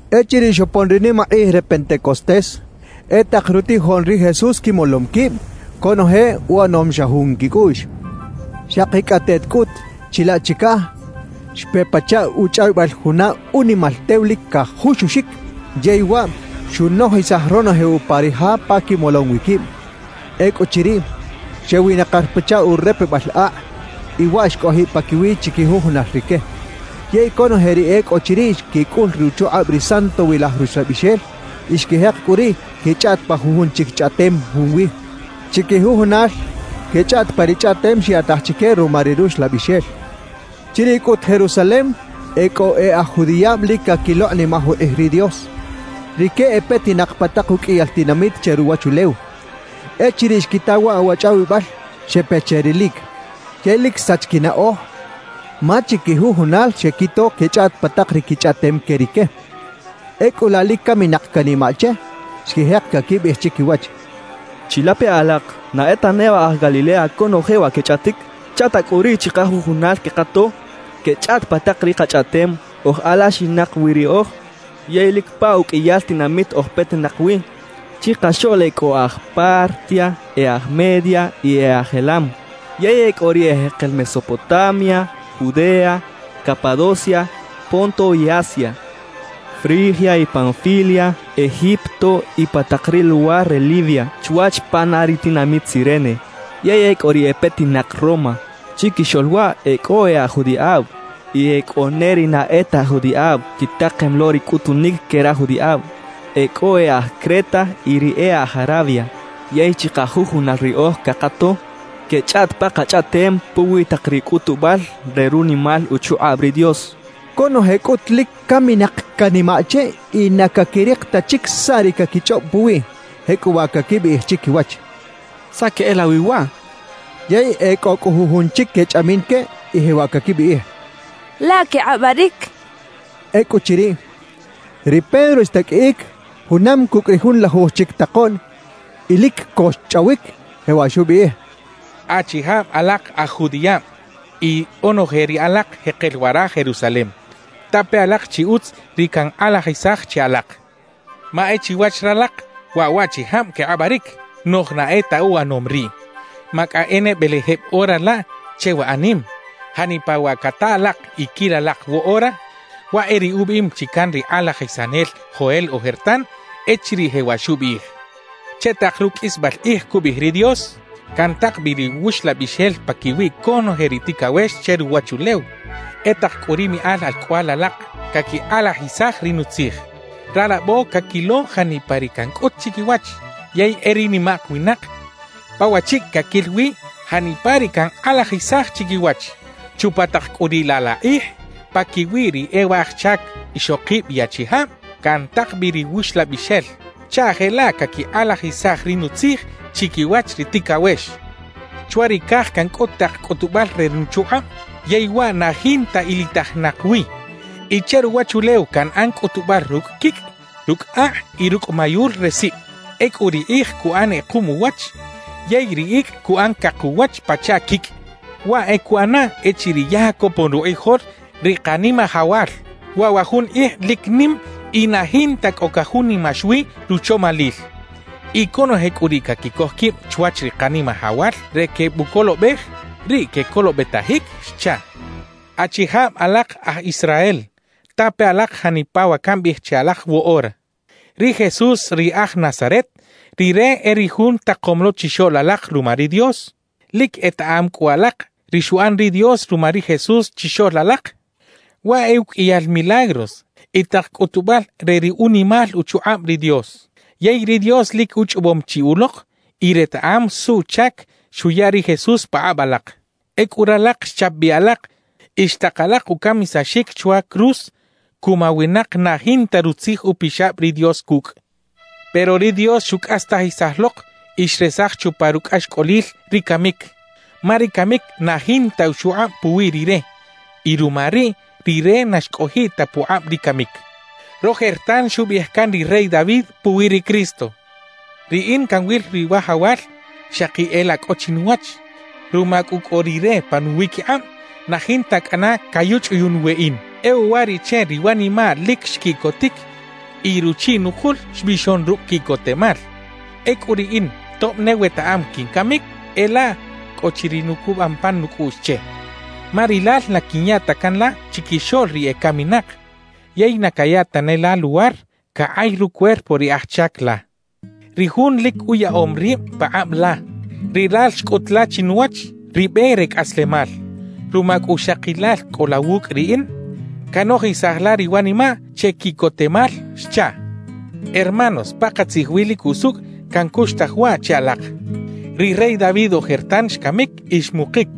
Echiriꞌ xopon ri nimakꞌij re Pentecostés e tak rutijoꞌn ri Jesús quimolom quib, conoje uꞌanom xa jun quicꞌuꞌx. Xakicꞌateꞌt cꞌut chilaꞌ chicaj xpe pachaꞌ uchꞌawibal juna unimal tew lic cajuxuxic, yey waꞌ xunojisaj ronoje upa ri ja pa quimolom wi quib. Ecꞌuchiriꞌ, xewinakir pachaꞌ urepebal akꞌ y waꞌ xcꞌojiꞌ paquiwiꞌ chiquijujunal rique. Yey conoje ri e cꞌo chiriꞌ xquicꞌul ruchukꞌab ri Santowilaj Ruxlabixel, y xquijek cꞌu riꞌ quechꞌaꞌt pa jujun chic chꞌaꞌtem junwi. Chiquijujunal quechꞌaꞌt pa ri chꞌaꞌtem xyaꞌtaj chique ruma ri Ruxlabixel. Chiriꞌ cꞌut Jerusalem e cꞌo e aj judiꞌab lic caquilokꞌnimaj ukꞌij ri Dios. Rique e petinak pa tak uqꞌuiyal tinamit che ruwachulew. Echiriꞌ xquita waꞌ wa chꞌawibal, xepe che rilic. Yey lic xsach quinaꞌoj ma chiquijujunal xequito quechꞌaꞌt pa tak ri quichꞌaꞌtem que rique. Ecꞌu laꞌ lic caminak canimaꞌ che, xquijek caquibiꞌij chiquiwach: «¡Chilape alak! ¿Na e ta neba aj Galilea conoje wa quechꞌaꞌtic? ¿Chaꞌta cꞌu riꞌ chikajujunal quekato quechꞌaꞌt pa tak ri kachꞌaꞌtem oj alaxinak wi riꞌoj? Yey lic pa uqꞌuiyal tinamit oj petinak wi. Chikaxoꞌl e cꞌo e aj Partia, e aj Media y e aj Elam. Yey e cꞌo ri ejekel Mesopotamia, Judea, Capadocia, Ponto y Asia, Frigia y Panfilia, Egipto y pa tak ri luwar re Libia chwach pana ri tinamit Cirene. Yey e cꞌo ri e petinak Roma; chiquixoꞌl waꞌ e cꞌo e aj judiꞌab y e cꞌo ne ri na e ta aj judiꞌab quitakem lo ri cꞌutunic que raj judiꞌab. E cꞌo e aj Creta y ri e aj Arabia. Yey chikajujunal riꞌoj cakato quechꞌaꞌt pa kachꞌaꞌtem puwi tak ri cꞌutubal re runimal uchukꞌab ri Dios» quechaꞌ. Conoje cꞌut lic caminak canimaꞌ che y na caquirik ta chic saꞌ ri caquichꞌob puwiꞌ, jecꞌuwaꞌ caquibiꞌij chiquiwach: «¿Saꞌ queꞌelawi waꞌ?» quechaꞌ. Yey e cꞌo cꞌu jujun chic quechꞌamin que y jewaꞌ caquibiꞌij: «Laꞌ quekꞌabaric» quechaꞌ. Ecꞌuchiriꞌ, ri Pedro xtaqꞌuiꞌic junam cucꞌ ri junlaluj chic takoꞌn y lic co xchꞌawic, jewaꞌ xubiꞌij: «Achijab alak aj judiꞌab y onoje ri alak jekel wara Jerusalem, tape alak chi utz ri cankꞌalajisaj che alak. Ma e chiwach ralak, waꞌ waꞌchijab quekꞌabaric, noꞌj ¡na e ta uꞌanom riꞌ! Ma cꞌa e ne belejeb ora laꞌ che wa anim. Janipa wa cata alak y quil alak woꞌora, waꞌ e ri ubiꞌim chi can ri kꞌalajisanel Joel ojertan, echiriꞌ jewaꞌ xubiꞌij: “Che tak ruqꞌuisbal kꞌij” cubiꞌij ri Dios, “cantak bi ri Wuxlabixel paquiwi conoje ri ticawex che ruwachulew. E tak cꞌu ri miꞌal alcꞌoꞌal alak caquikꞌalajisaj ri Nutzij. Ralabo caquilo janipa ri cancꞌut chiquiwach; yey e ri nimak winak, pa wachicꞌ caquil wi janipa ri cankꞌalajisaj chiquiwach. Chupa tak cꞌu riꞌ laꞌ la kꞌij, paquiwi ri e waj chac ixokib y achijab cantak bi ri Wuxlabixel chaꞌ jelaꞌ caquikꞌalajisaj ri Nutzij chiquiwach ri ticawex. Chwa ri caj cancꞌut tak cꞌutubal re nuchukꞌab yey waꞌ na jinta ilitajinak wi y che ruwachulew canꞌan cꞌutubal rucꞌ quicꞌ, rucꞌ akꞌ y rucꞌ mayul re sib. Ecꞌu ri kꞌij cuꞌan kꞌekuꞌm uwach yey ri icꞌ cuꞌan cak uwach pachaꞌ quicꞌ; waꞌ e cuꞌana echiriꞌ ya copon rukꞌijol ri Kanimajawal. Waꞌ wa jun kꞌij lic nim y na jinta cꞌo cajunimax wi ruchomalil. Y conoje cꞌu ri caquicoj quib chwach ri Kanimajawal re quebucolobej, riꞌ quecolobetajic” xchaꞌ. »Achijab alak aj Israel, tape alak janipa wa cambiꞌij che alak woꞌora: Ri Jesús ri aj Nazaret, Rire e ri Jun takom lo chixoꞌl alak ruma ri Dios. Lic etaꞌam cꞌu alak ri xuꞌan ri Dios ruma ri Jesús chixoꞌl alak, waꞌ e uqꞌuiyal milagros y tak cꞌutubal re ri unimal uchukꞌab ri Dios. Yey ri Dios lic uchꞌobom chi ulok y retaꞌam suꞌchac xuya ri Jesús pakꞌab alak. Ecꞌu ralak xchap bi alak y xtak alak ucamisaxic chwa cruz cuma winak na jinta Rutzij Upixab ri Dios cucꞌ. Pero ri Dios xucꞌastajisaj lok y xresaj chupa rucꞌaxcꞌolil ri camic, ma ri camic na jinta uchukꞌab puwi Rire y ruma riꞌ, Rire na xcꞌojiꞌ ta pukꞌab ri camic. »Rojertan xubiꞌij can ri rey David puwi ri Cristo: Riꞌin canwil ri Wajawal xaki e laꞌ cꞌo chinuwach. Ruma cꞌu cꞌo Rire pa nuwiquikꞌab, na jinta cꞌana cayuchꞌuyuꞌn weꞌin. E uwariꞌche ri wanimaꞌ lic xquiꞌcotic y ruchiꞌ nukul xbixon rucꞌ quiꞌcotemal. Ecꞌu riꞌin, tob ne wetaꞌam quincamic, e laꞌ cꞌo chi ri nucubam pan nucꞌuꞌx che; ma Rilal na quinya ta can la chiquixoꞌl ri ecaminak, yey na caya tane la luwar cakꞌay rucuerpo ri aj chac la, ri jun lic uyaꞌom rib pakꞌab la. Rilal xcꞌut la chinuwach ri be re cꞌaslemal. Ruma cꞌu xaki Lal cꞌo la wucꞌ riꞌin, canojisaj la ri wanimaꞌ che quiꞌcotemal xchaꞌ. »Hermanos, pakatzij wi lic usucꞌ cancuxtaj waꞌ che alak: Ri rey David ojertan, xcamic y xmukic,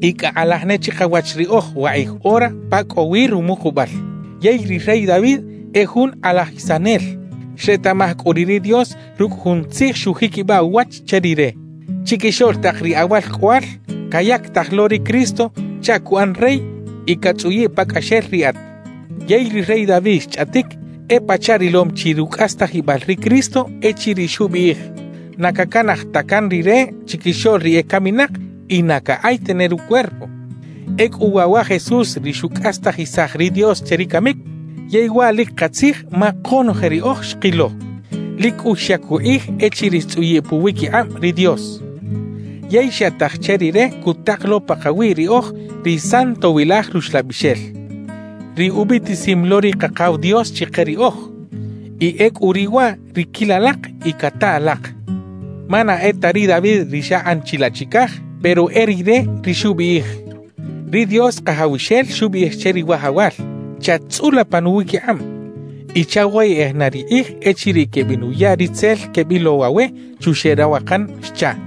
y cꞌa kꞌalaj ne chikawach riꞌoj wakꞌij ora pa cꞌo wi rumukubal. Yey ri rey David e jun kꞌalajisanel; xretaꞌmaj cꞌu riꞌ ri Dios rucꞌ jun tzij xujiquibaꞌ uwach che rire: “Chiquixoꞌl tak ri awalcꞌoꞌal, cayactaj lo ri Cristo chaꞌ cuꞌan Rey y catzꞌuyiꞌ pacꞌaxel riꞌat.” »Yey ri rey David xchꞌaꞌtic e pachaꞌ rilom chi rucꞌastajibal ri Cristo echiriꞌ xubiꞌij: “Na cacanaj ta can Rire chiquixoꞌl ri ecaminak y na cakꞌay tane rucuerpo.” Ecꞌu waꞌ wa Jesús ri xucꞌastajisaj ri Dios che ri camic; yey waꞌ lic katzij, ma konoje riꞌoj xkilo. Lic cꞌu xyac ukꞌij echiriꞌ xtzꞌuyiꞌ puwiquikꞌab ri Dios. Yey xyaꞌtaj che Rire cutak lo pakawi riꞌoj ri Santowilaj Ruxlabixel, ri ubiꞌtisim lo ri Kakaw Dios chike riꞌoj. Y ecꞌu riꞌ waꞌ ri quil alak y cata alak. »Ma na e ta ri David ri xakꞌan chilaꞌ chicaj, pero e rire ri xubiꞌij: Ri Dios Kajawxel xubiꞌij che ri Wajawal: “Chat-tzꞌula pa nuwiquikꞌab, y chawoyeꞌej na ri kꞌij echiriꞌ quebenuya ri tzel quebilow awe chuxeꞌ rawakan” xchaꞌ.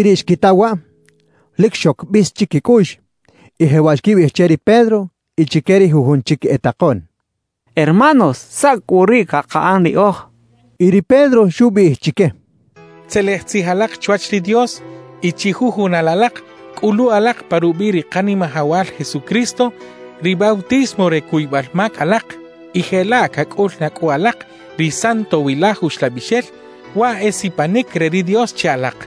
Ecꞌuchiriꞌ xquita waꞌ, lic xoc bis chiquicꞌuꞌx y jewaꞌ xquibiꞌij che ri Pedro y chique ri jujun chic e takoꞌn: —Hermanos, ¿saꞌ cꞌu riꞌ cakaꞌan riꞌoj? —xechaꞌ. Y ri Pedro xubiꞌij chique: —Tzelej tzij alak chwach ri Dios y chijujunal alak cꞌulu alak pa rubiꞌ ri Kanimajawal Jesucristo ri bautismo re cuybal mac alak y jelaꞌ cacꞌul na cꞌu alak ri Santowilaj Uxlabixel, waꞌ e sipanic re ri Dios che alak.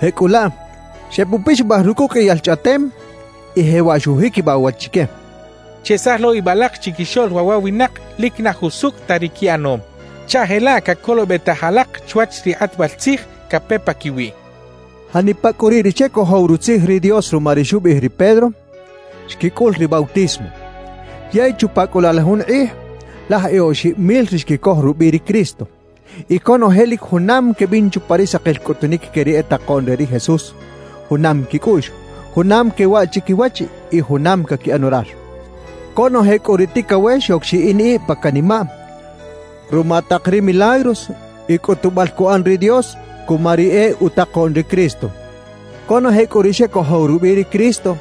Jecꞌulaꞌ, xebupixabaj rucꞌ uqꞌuiyal chꞌaꞌtem y jewaꞌ xujiquibaꞌ uwach chique: —Chesaj lo ib alak chiquixoꞌl waꞌ wa winak lic na jusucꞌ ta ri quiꞌanom, chaꞌ jelaꞌ cacolobetaj alak chwach ri kꞌatbal tzij cape paquiwiꞌ —xcha chique. Janipa cꞌu riꞌ ri xecojow Rutzij ri Dios ruma ri xubiꞌij ri Pedro, xquicꞌul ri bautismo. Yey chupa cꞌu laꞌ la jun kꞌij, laj e oxib mil ri xquicoj rubiꞌ ri Cristo. Y conoje lic junam quebin chupa ri sakil cꞌutunic que ri e takoꞌn re ri Jesús, junam quicꞌuꞌx, junam quewaꞌ chiquiwach y junam caquiꞌan orar. Conoje cꞌu ri ticawex xoc xiꞌin ib pa canimaꞌ ruma tak ri milagros y cꞌutubal cuꞌan ri Dios cuma ri e utakoꞌn ri Cristo. Conoje cꞌu ri xecojow rubiꞌ ri Cristo,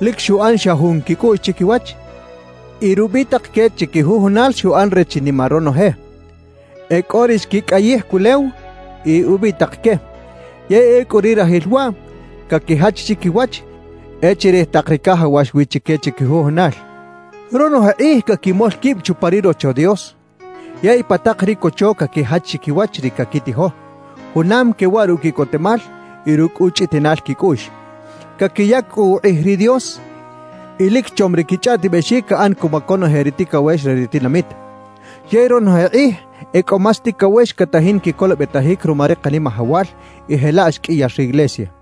lic xuꞌan xa jun quicꞌuꞌx chiquiwach y rubitak que chiquijujunal xuꞌan re chinima ronoje. E cꞌo ri xquicꞌayij culew y ubitak que, yey ecꞌu ri rajil waꞌ, caquijach chiquiwach e chirij tak ri cajawax wi chique chiquijujunal. Ronoje kꞌij caquimol quib chupa ri Rocho Dios. Yey pa tak ri cocho caquijach chiquiwach ri caquitijo, junam quewaꞌ rucꞌ quiꞌcotemal y rucꞌ uchꞌutiꞌnal quicꞌuꞌx. Caquiyac cꞌu ukꞌij ri Dios y lic chom ri quichꞌaꞌtibexic caꞌan cuma conoje ri ticawex re ri tinamit. Yey ronoje kꞌij e cꞌo más ticawex catajin quicolobetajic ruma ri Kanimajawal, y jelaꞌ xqꞌuiyar riglesia.